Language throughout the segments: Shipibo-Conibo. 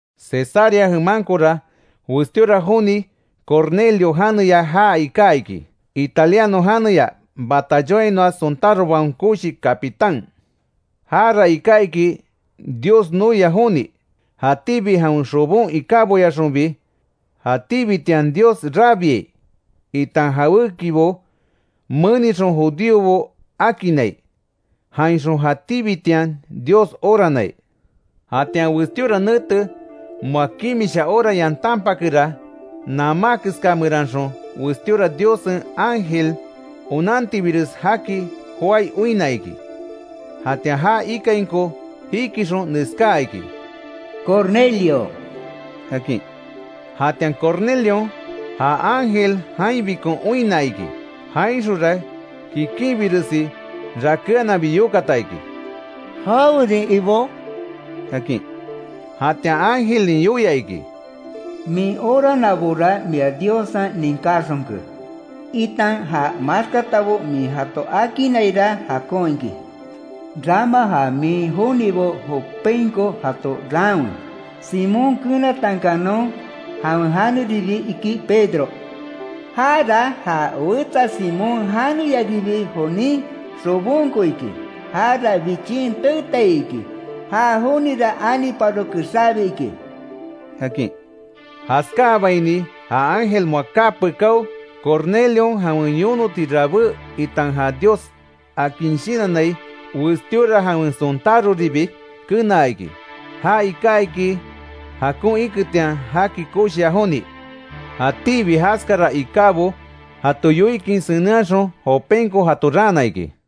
Cesarea jemankora westíora joni Cornelio janeya jaa iká iki, Italiano janeya batallónhainoa sontárobaon coshi capitán. Jara iká iki Dios noia joni; jatíbi jawen xobon ikáboyaxonbi jatíbitian Dios rabiai, itan jawékibo menixon judíobo akinnai, jainxon jatíbitian Dios oranai. Jatian westíora nete, moa kimisha ora yantanpakera, namá keska meranxon, westíora Diossen ángel onantibires jaki joái oinna iki. Jatian já ikainko jikixon neskáa iki: “¡Cornelio!” akin. Jatian Cornelion ja ángel jainbikon oinna iki. Jainxora, kikinbiresi rakeananbi yokata iki: “¿Jawerin Ibó?” akin. Jatian ángelnin yoia iki: “Min oranabora mia Diossen ninkáxonke, itan ja maxkatabo min jato akinnaira jakon iki. Rama ja min jonibo Jopenko jato raanwe, Simón kenatankanon, jawen janeribi iki, Pedro. Jara, ja wetsa Simón janeyaribi jonin xobonko iki, jara bichin teetai iki. Ja jonira aniparo kexabi iki”, akin. Jaskáabaini ja ángel moa kaa pekáo, Cornelion jawen yonoti rabé, itan ja Dios akin shinannai westíora jawen sontároribi kenaa iki, já iká iki, jakon iketian jaki koshia joni. Jatíbi jaskara ikábo jato yoikin senenhaxon, Jopenko jato raana iki.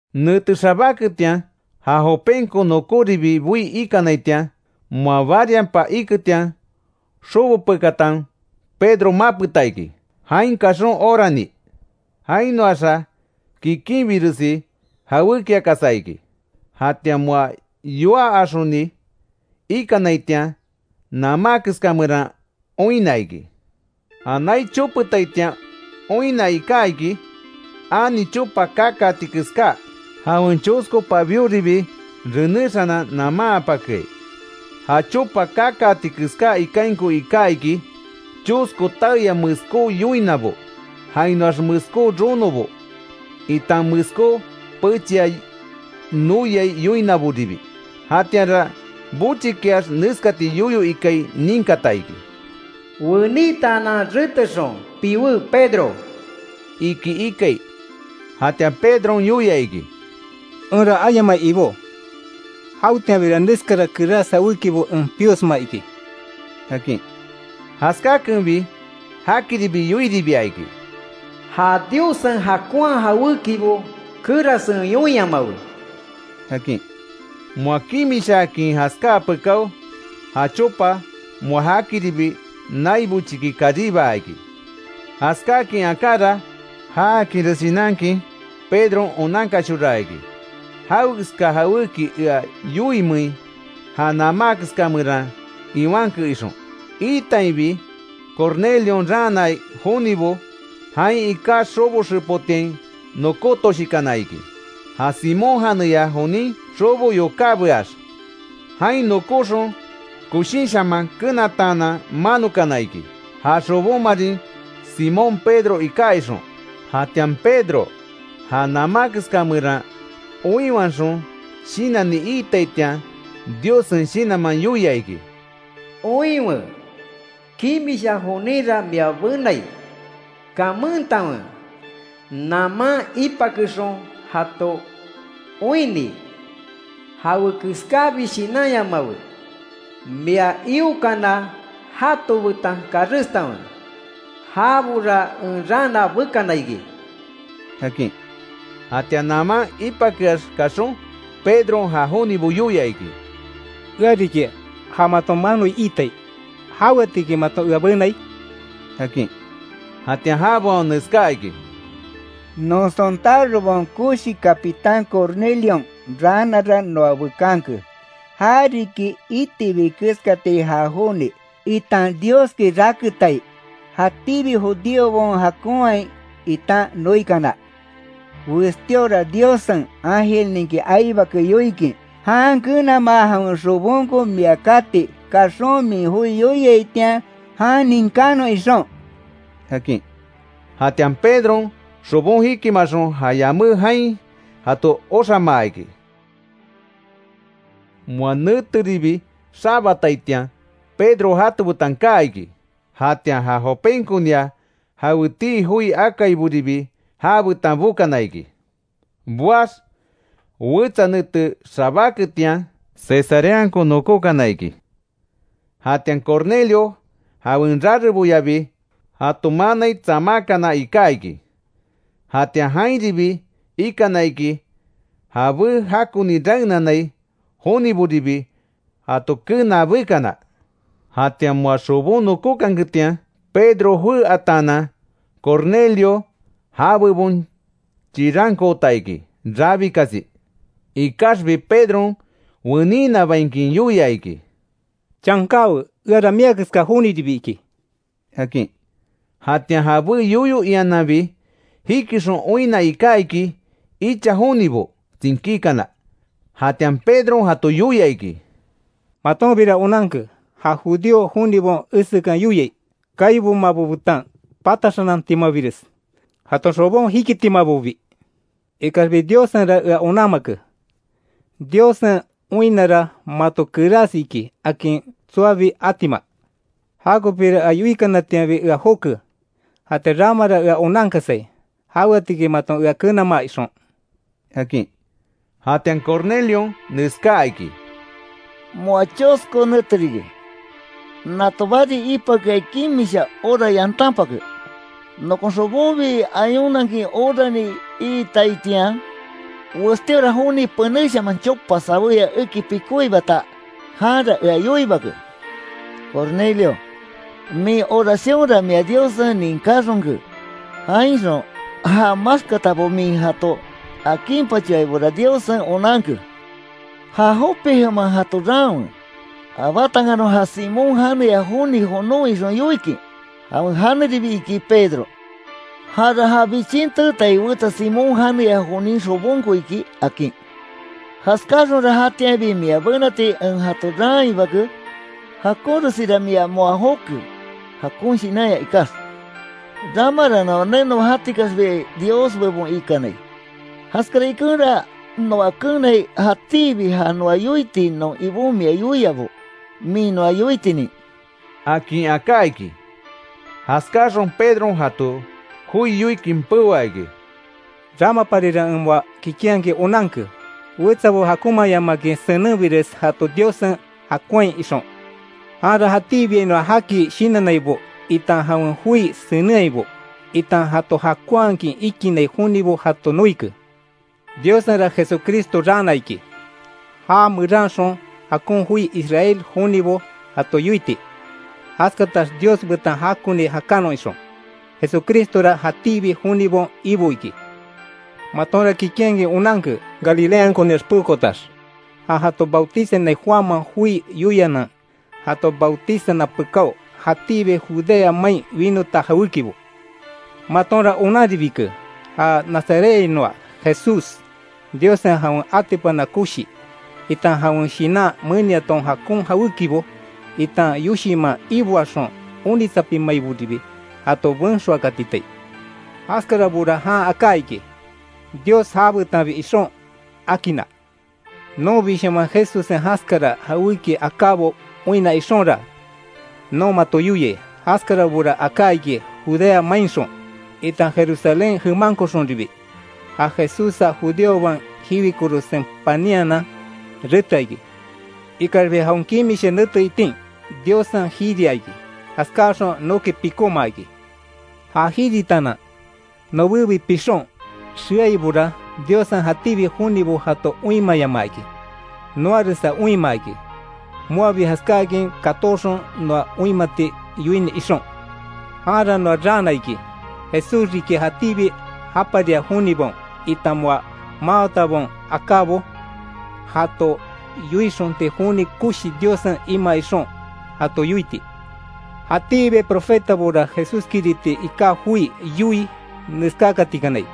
Nete xabáketian, ja Jopenko nokóribii boi ikanaitian, moa bariapan iketian xobo pekaten Pedro mapeta iki, jain kaxon orani. Jainoaxa, kikinbiresi jawékiakasa iki. Jatian moa yoá axoni ikanaitian, namá keska meran oinna iki. Ja nai chopetaitian oinna iká iki, ani chopa kakaati keská, jawen chosko pabíoribi renéxanan naman apakeai. Ja chopa kakaati keská ikainko iká iki, chosko taeya meskó yoinabo, jainoax meskó ronobo, itan meskó pechia noyai yoinaboribi. Jatianra bochikiax neskati yoyo ikai ninkata iki: “Wenítaanan, retexon piwé Pedro”, iki ikai. Jatian Pedron yoia iki: “Enra ayamai Ibó. Jawetianbira neskara kerás jawékibo en piosma iki”, akin. Jaskákenbi, jakiribi yoiribia iki: “Ja Diossen jakonhaa jawékibo kerasen yoinyamawe”, akin. Moa kimishaakin jaskáa pekáo, ja chopa moa jakiribi nai bochiki karíbaa iki. Jaskáakin akára, jaakinres shinankin Pedron onankashoraa iki, jawekeska jawéki ea yoiimein ja namá keska meran iwanke ixon. Iitainbi Cornelion raana jonibo, jain iká xobo xepotiain nokótoshikana iki, ja Simón janeya jonin xobo yokábeax. Jain nokóxon, koshinshaman kenátaanan manokana iki, ja xobonmarin Simón Pedro iká ixon. Jatian Pedro, ja namá keska meran oinwanxon, shinanni iitaitian, Diossen Shinanman yoia iki: “Oinwe, kimisha joninra mia benai. Kamentanwe, naman ipakexon jato oinni. Jawe keskabi shinanyamawe, mia iokana jato betan karestanwe. Jabora en raana bekana iki”, akin. Jatian naman ipakeax kaxon, Pedron ja jonibo yoia iki: —Ea riki, ja maton manoi iitai ¿Jaweatiki maton ea benai? —akin. Jatian jabaon neskaa iki: —Non sontárobaon koshi capitán Cornelion raanara noa bekanke. Ja riki itibi keskati jaa joni, itan Dioski raketai, jatíbi judíobaon jakonhai, itan noikana. Westíora Diossen ángelninki aibake yoikin, jan kenamaa jawen xobonko mia kati, kaxon min joi yoiaitian, jan ninkánon ixon —akin. Jatian Pedron, xobon jikimaxon, ja yamé jain jato oxamaa iki. Moa neteribi xabataitian, Pedro jato betan kaa iki, jatian ja Jopenkonia jawetii joi akaiboribi já betan bokana iki. Boax, wetsa nete xabáketian, Cesareanko nokókana iki. Jatian Cornelio jawen rareboyabi, jato manai tsamákana iká iki. Jatian jainribi ikana iki, jabé jakoni raenanai joniboribi jato kenaa, bekana. Jatian moa xobon nokókanketian, Pedro joé ataanan, Cornelio, já bebon chirankoota iki, rabikasi. Ikaxbi Pedron weniinnabainkin yoia iki: —Chankawe, eara mia keska joniribi iki —akin. Jatian jabé yoyo iananbi, jikixon oinna iká iki, icha jonibo tsinkíkana. Jatian Pedron jato yoia iki: —Matonbira onanke, ja judío jonibaon esekan yoiai, kaibomabo betan pataxanantimabires, jaton xobon jikitimabobi. Ikaxbi Diossenra ea onanmake, Diossen oinnara mato kerás iki akin tsoabi atima. Jakopira, yoikanatianbi ea joke. Jatian ramara ea onankasai, jaweatiki maton ea kenamaa ixon —akin. Jatian Cornelion neskaa iki: —Moa chosko nete riki, nato bari ipakeai kimisha hora yantanpake, nokon xobonbi ayunankin orani iitaitian, westíora joni penéshaman chopa saweya eki pikoibata. Janra ea yoiibake: ‘Cornelio, min oraciónra mia Diossen ninkáxonke, jainxon ja maxkatabo min jato akinpachoaibora Diossen onanke. Ja Jope jeman jato raanwe. Abátankanon ja Simón janeya joni jonon ixon yoikin, jawen janeribi iki Pedro. Jara ja bichin teetai wetsa Simón janeya jonin xobonko iki’, akin. Jaskáxonra jatianbi mia benati en jato raanhaibake. Jakonresira mia moa joke, jakon shinanya ikax. Ramara noa neno jatikaxbi Dios bebon ikanai. Jaskara ikenra noa keenai, jatíbi ja noa yoiti non Ibon mia yoiabo, min noa yoitinin —akin aká iki. Jaskáxon Pedron jato joi yoikin peoa iki: —Ramaparira en moa kikinhakin onanke, wetsabo jakonmaayamakin senenbires jato Diossen jakonhai ixon. Janra jatíbiainoa jaki shinannaibo itan jawen joi senenhaibo, itan jato jakonhakin ikinai jonibo jato noike. Diossenra Jesucristo raana iki, já meranxon jakon joi Israel jonibo jato yoiti. Jaskatax Dios betan jakoni jakanon ixon. Jesucristora jatíbi jonibaon Ibo iki. Matonra kikinhakin onanke, Galileankoniax peokootax, ja jato bautizanai Juanman joi yoianan, jato bautizana pekáo, jatíbi Judea main winota jawékibo. Matonra onanribike, ja Nazarethainoa Jesús, Diossen jawen atipana koshi, itan jawen Shinan meniaton jakon jawékibo, itan yoshiman iboaxon onitsapimaiboribi, jato benxoakatitai. Jaskarabora jan aká iki, Dios jabetanbi ixon, akinna. Nonbishaman Jesussen jaskara jawéki akábo oinna ixonra, non mato yoiai, jaskarabora aká iki Judea mainxon, itan Jerusalén jemankoxonribi. Ja Jesússa judíobaon jiwi korosen panihannan retea iki. Ikaxbi jawen kimisha nete itin, Diossen jiria iki, jaskáxon noki pikomaa iki. Ja jiritaanan, nobébi pixon, xeaibora, Diossen jatíbi jonibo jato oinmayamaa iki. Noaresa oinmaa iki, moabi jaskáakin katóxon noa oinmati yoini ixon. Janra noa raana iki, Jesús riki jatíbi japaria jonibaon, itan moa mawatabaon akábo, jato yoixonti joni koshi Diossen imaa ixon, jato yoiti. Jatíbi profetabora Jesúskiriti iká joi yoii neskákatikanai,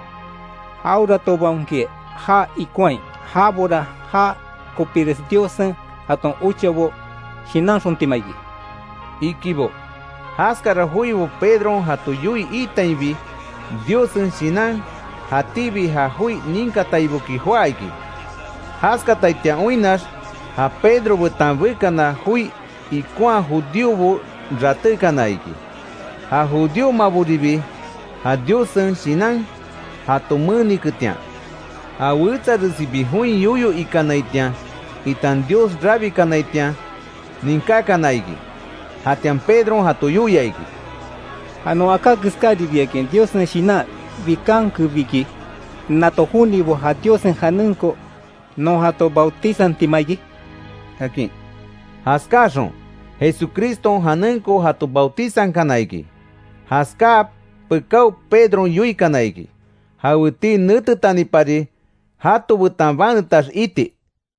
jaweratobaonki já ikonhai, jabora já kopires Diossen jaton ochabo shinanxontima iki —ikibo. Jaskara joibo Pedron jato yoii iitainbi, Diossen Shinan jatíbi ja joi ninkataiboki joá iki. Jaskataitian oinnax, ja Pedro betan bekana joi ikonhaa judíobo ratékana iki; ja judíomaboribi ja Diossen Shinan jato meniketian. Ja wetsaresibi join yoyo ikanaitian itan Dios rabikanaitian ninkákana iki. Jatian Pedron jato yoia iki: —¿Ja non aká keskaribiakin Diossen Shinan bikankenbiki, nato jonibo ja Diossen janenko non jato bautizantima iki? —akin. Jaskáaxon, Jesucriston janenko jato bautizankana iki. Jaskáa pekáo Pedro yoikana iki, jawetii netetanipari jato betan banetax iti.